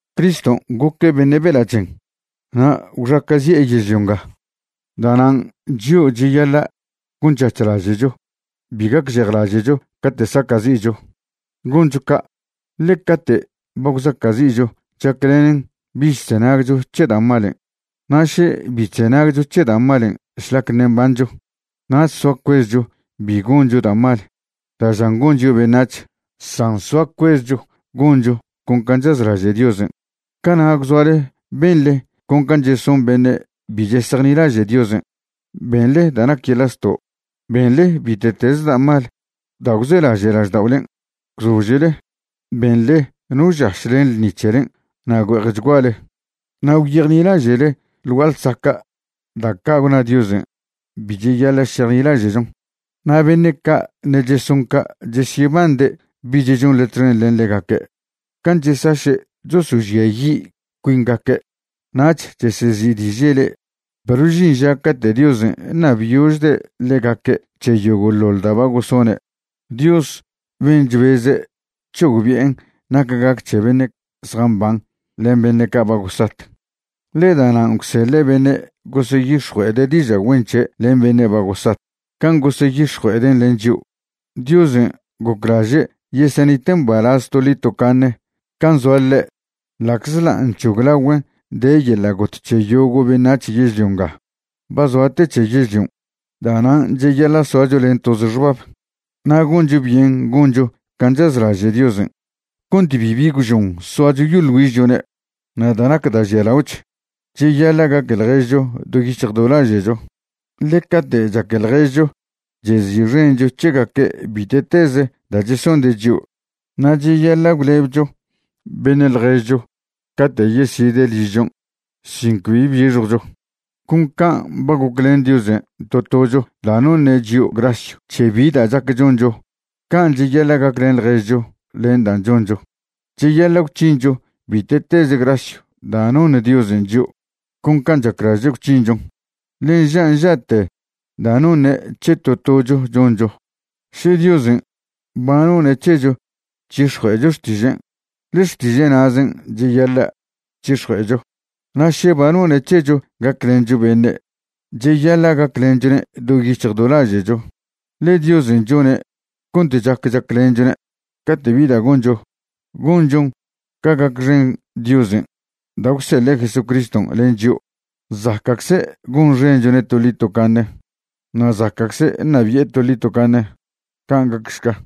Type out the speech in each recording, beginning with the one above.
Criston' goque' beṉe' bela' chen na' gwxaca'zi'e yežlio nga, da'nan' chio' cheyaḻa' gonc̱hac̱hlaže'cho bi gacžejlaže'cho cate' saca'zi'cho. Goncho ca', ḻe cate' ba gwzaca'zi'cho chaclenen bich chzenagcho c̱he da' malen'. Na' še bi chzenagcho c̱he da' malen' šlac ṉe' mbancho, nach soa cuezcho bi goncho da' mal da' žan gon chio' beṉac̱h, san soa cuezcho goncho con can' chazlaže' Diosen'. Cana' gwzoale benḻe con can' cheson beṉe' bi chesejnilaže' Diosen'. Benḻe da' nac yeḻa' zto', benḻe bite'teze da' mal da' gwzelaže' lažda'olen', gwzožele, benḻe no žaš len ḻṉi c̱helen' na' güe'ejchguale, na' gwyejnilaže'le ḻ gua'a ḻsaca' da' ca' gwna Diosen' bi cheyaḻa' šejnilaže'chon. Na' beṉe' ca' ṉe' cheson ca' chesyebande' bich chonḻe txen len ḻegaque' can' chesaše' chosožiayi' cuingaque', nach chesezi'diže' le'e. Perw žin ža cate' Diosen' ṉabyožde' ḻegaque' c̱he yogo'ḻoḻ da' ba gosone', Dios ben' chbeze' c̱hogbi'en nac gac c̱he beṉe' zjamban len beṉe' ca' ba gosat. Ḻe da'nan' gwseḻe' beṉe' goseyix̱jue'ede' diža' güen c̱he' len beṉe' ba gosat can' goseyix̱jue'eden' len chio'. Diosen' goclaže' yesenite' mbalaz toḻi tocaṉe' can' zoa ḻe', ḻa'czḻa' nc̱hoglagüen' de yeḻa' got c̱he yogo' beṉac̱h yežlio nga. Ba zoa te c̱he yežlion'. Da'nan' cheyaḻa' soacho len toze xbab na' goncho byen goncho can' chazlaže' Diosen' cont bibi gwžon soacho yoḻ güižchone'. Na' da' nac da' žialaoch, cheyaḻa' gaque ḻježcho do yic̱hj do laže'cho, ḻe cate' chaque ḻježcho chezi'xencho c̱hegaque' bite'teze da' chesonde' chio'. Na' cheyaḻa' gwlebcho beṉe' ḻježcho cate' yeside' ližchon' sin cbi bixjwcho. Con can' ba goclen Diosen' to tocho da' noṉe' chio' grasyw c̱he bi da' chac choncho, can' cheyaḻa' gaclen ḻježcho len dan' choncho. Cheyaḻa' gwc̱hincho bite'teze grasyw da' noṉ Diosen' chio' con can' chaclaže' gwc̱hinchon, ḻe nža' nža'te da' noṉe' c̱he to tocho choncho. Še Diosen' ba none' c̱hecho c̱hix̱jue'echo xtižen', ḻe xtiže' na'zen' cheyaḻa' c̱hix̱jue'echo. Na' še ba none' c̱hecho gaclencho beṉe', cheyaḻa' gaclenchone' do yic̱hj do laže'cho, ḻe Diosen' chone' cont chac chaclenchone'. Cate' bi da' goncho, gonchon ca gacxen Diosen' da' gwseḻe' Jesucriston' len chio'. Zaca'cze' gonxenchone' toḻi tocaṉe na' zaca'cze' ṉabi'e toḻi tocaṉe. Can' gacšca.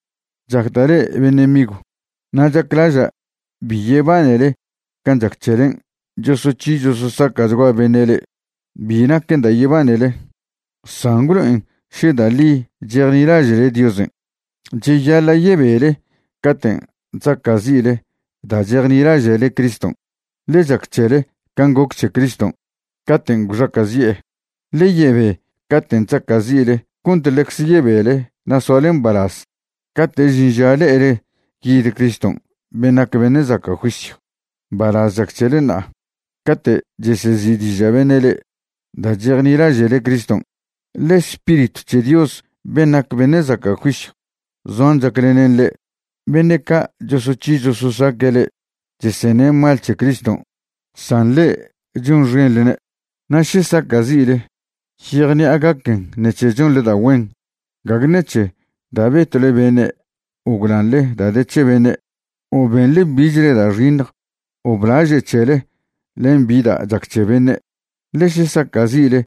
Chacda' le'e beṉe' migw, na' chaclaža' bi yebanele can' chac c̱helen' chosoc̱hi chososaca'chgua beṉe' le'e. Bi naquen da' yebanele, san gwlo'en še da' ḻi chejnilaže'le Diosen'. Cheyaḻa' yebele caten' chzaca'zi'le da' chejnilaže'le Criston', ḻe chac c̱hele can' goc c̱he Criston' caten' gwxaca'zi'e. Ḻe yebe caten' chzaca'zi'le cont ḻecze yebele na' soale mbalaz cate' žin ža le'ele yid Criston' ben' nac beṉe' zaca' juisyw. Mbalaz chac c̱hele ṉa'a cate' chesezi'diža' beṉe' le'e da' chejnilaže'le Criston', ḻe Spiritw c̱he Dios ben' nac beṉe' zaca' juisyw zoan chaclenen le'e. Beṉe' ca' chosoc̱hi chososaque' le'e cheseṉe' mal c̱he Criston', san le'e chonxenḻne'. Na' še saca'zi'le, yejṉi'a gaquen ṉec̱he chonḻe da' güen, gague ṉec̱he da' betwle beṉe' o gwlanḻe da' de c̱he beṉe' o benḻe bichle da' xiṉj o blaže' c̱hele len bi da' chac c̱he beṉe'. Ḻe še saca'zi'le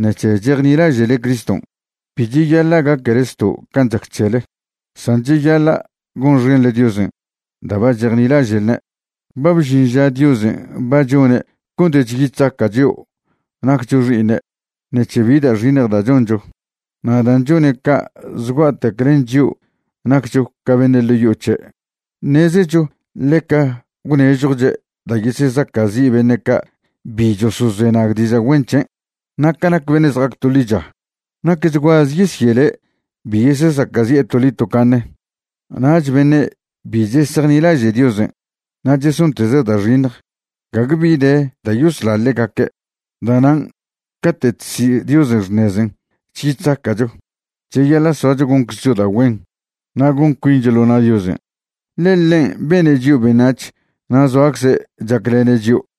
ṉec̱he chejnilaže'le Criston', bi cheyaḻa' gaquele zto' can' chac c̱hele, san cheyaḻa' gonxenḻe Diosen' da' ba chejnilaže'lne'. Ba bžin ža Diosen' ba chone' cont chyi chzaca' chio' naccho xi'iṉe' ṉec̱he bi da' xiṉj da' choncho. Na' dan' chone' ca' zgua'tec len chio' naccho ca beṉe' ḻo' yo'o c̱he', ṉezecho ḻeca gwnežjwche' da' yesezaca'zi' beṉe' ca' bi chosozenag diža' güen c̱hen'. Na' ca nac beṉe' zja'ac to ḻicha, nacchguaze yesyele' bi yesezaca'zi'e toḻi tocaṉe, nach beṉe' bi chesejnilaže' Diosen' na' chesonteze' da' xiṉj, gague bi de da' yosla ḻegaque'. Da'nan' cate' chsi' Diosen' xṉezen' chyi chzaca'cho, cheyaḻa' soacho gonczcho da' güen na' gon cuincho ḻo na' Diosen', ḻe ḻen' bene' chio' beṉac̱h na' zoacze' chaclene' chio'.